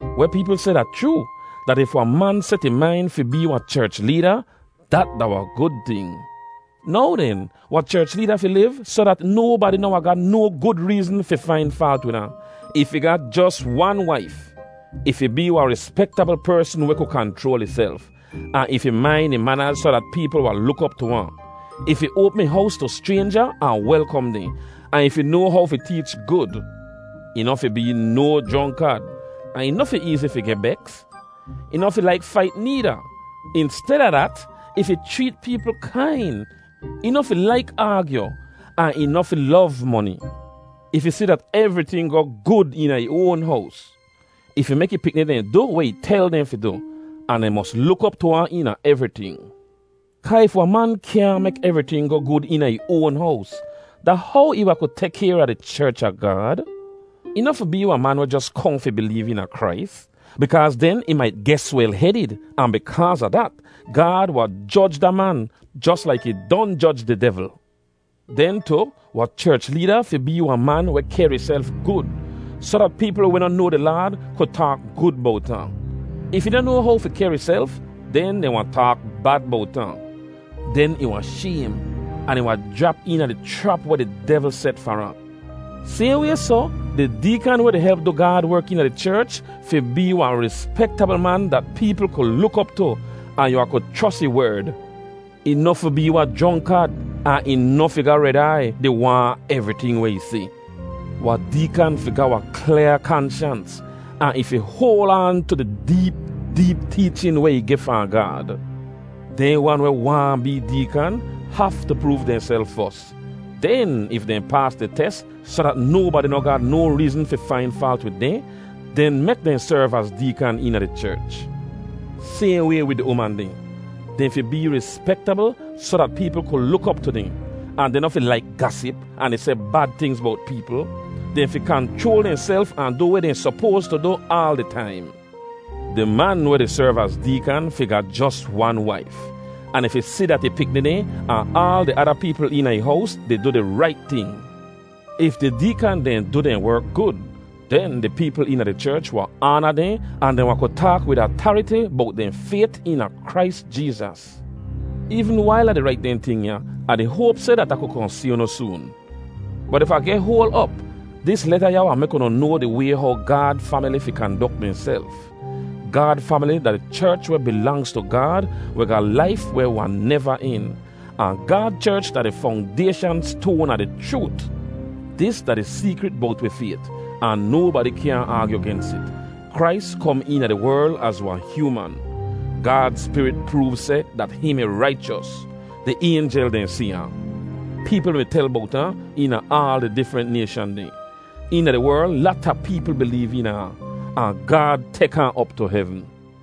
Weh peepl seh da chroo, dat if wahn man set ih main fi bee wahn cherch leeda, dat da wahn gud ting. Now den, wahn cherch leeda fi liv soh dat nobadi noh wahn ga no gud reezn fi fain faalt wid ahn. Ih fi ga jos wan waif. Ih fi bee wahn rispektabl persn weh ku kanchroal ihself. Ahn ih fi main ih manaz soh dat peepl wahn luk op tu ahn. Ih fi oapm ih hows tu schraynja ahn welkom dehn, ahn ih fi noa how fi teech gud. Ih noh fi bee no jronkad, ahn ih noh fi eezi fi geh beks; ih noh fi laik fait needa. Insteda dat, ih fi chreet peepl kain. Ih noh fi laik aagyu. Ahn ih noh fi lov moni. Ih fi si dat evriting goh gud eena ih oan hows. Ih fi mek ih pikni dehn du weh ih tel dehn fi du, ahn dehn mos luk op tu ahn eena evriting. Kaa if wahn man kyaahn mek evriting goh gud eena ih oan hows, da how ih wahn ku tek kayr a di cherch a Gaad? Ih noh fi bee wahn man weh jos kohn fi bileev eena Krais, bikaaz den ih mait geh swel-hedid, ahn bikaaz a dat, Gaad wahn joj da man, jos laik ih don joj di devl. Den tu, wahn cherch leeda fi bee wahn man weh kehr ihself gud, soh dat peepl weh noh noa di Laad ku taak gud bowt ahn. If ih noh noa how fi kehr ihself, den dehn wahn taak bad bowt ahn. Den ih wahn shaym, ahn ih wahn jrap eena di chrap weh di devl set far ahn. Sayhn way soh, di deekan weh di help du Gaad werk eena di cherch fi bee wahn rispektabl man dat peepl ku luk op tu, ahn yu wahn ku chros ih werd. Ih noh fi bee wahn jronkad, ahn ih noh fi ga red aiy, di waahn evriting weh ih si. Wahn deekan fi ga wahn klyaa kanshans, ahn ih fi hoal aan tu di deep deep teechin weh ih geh fahn Gaad. Dehn wan weh waahn bee deekan haftu proov dehnself fos. Den, if dehn paas di tes soh dat nobadi noh ga no reezn fi fain faalt wid dehn, den mek dehn serv az deekan eena di cherch. Sayhn way wid di uman dehn. Dehn fi bee rispektabl soh dat peepl ku luk op tu dehn, ahn dehn noh fi laik gasip, ahn di seh bad tingz bowt peepl. Dehn fi kanchroal dehnself ahn du weh dehn sopoas tu du aal di taim. Di man weh di serv az deekan fi ga jos wan waif, ahn ih fi si dat ih pikni dehn ahn aal di ada peepl eena ih hows di du di rait ting. If di deekan dehn du dehn werk gud, den di peepl eena di cherch wahn aana dehn ahn dehn wahn ku taak wid atariti bowt dehn fayt eena Krais Jeezas. Eevn wail Ah di rait dehn ting ya, Ah di hoap seh dat Ah ku kohn si unu soon. Bot if Ah geh hoal op, dis leta ya wahn mek unu noa di way how Gaad famili fi kandok dehnself. Gaad famili da di cherch weh bilangz tu Gaad weh ga laif weh wahn neva en. Ahn Gaad cherch da di fongdayshan stoan a di chroot. Dis da di seekrit bowt wi fayt, ahn nobadi kyaahn aagyu gens it: Krais kom eena di werl az wahn hyooman. Gaad Spirit proov seh dat hihn mi raichos. Di aynjel dehn si ahn. Peepl mi tel bowt ahn eena aal di difrent nayshan dehn. Eena di werl lata peepl bileev eena ahn. Ahn Gaad tek ahn op tu hevn.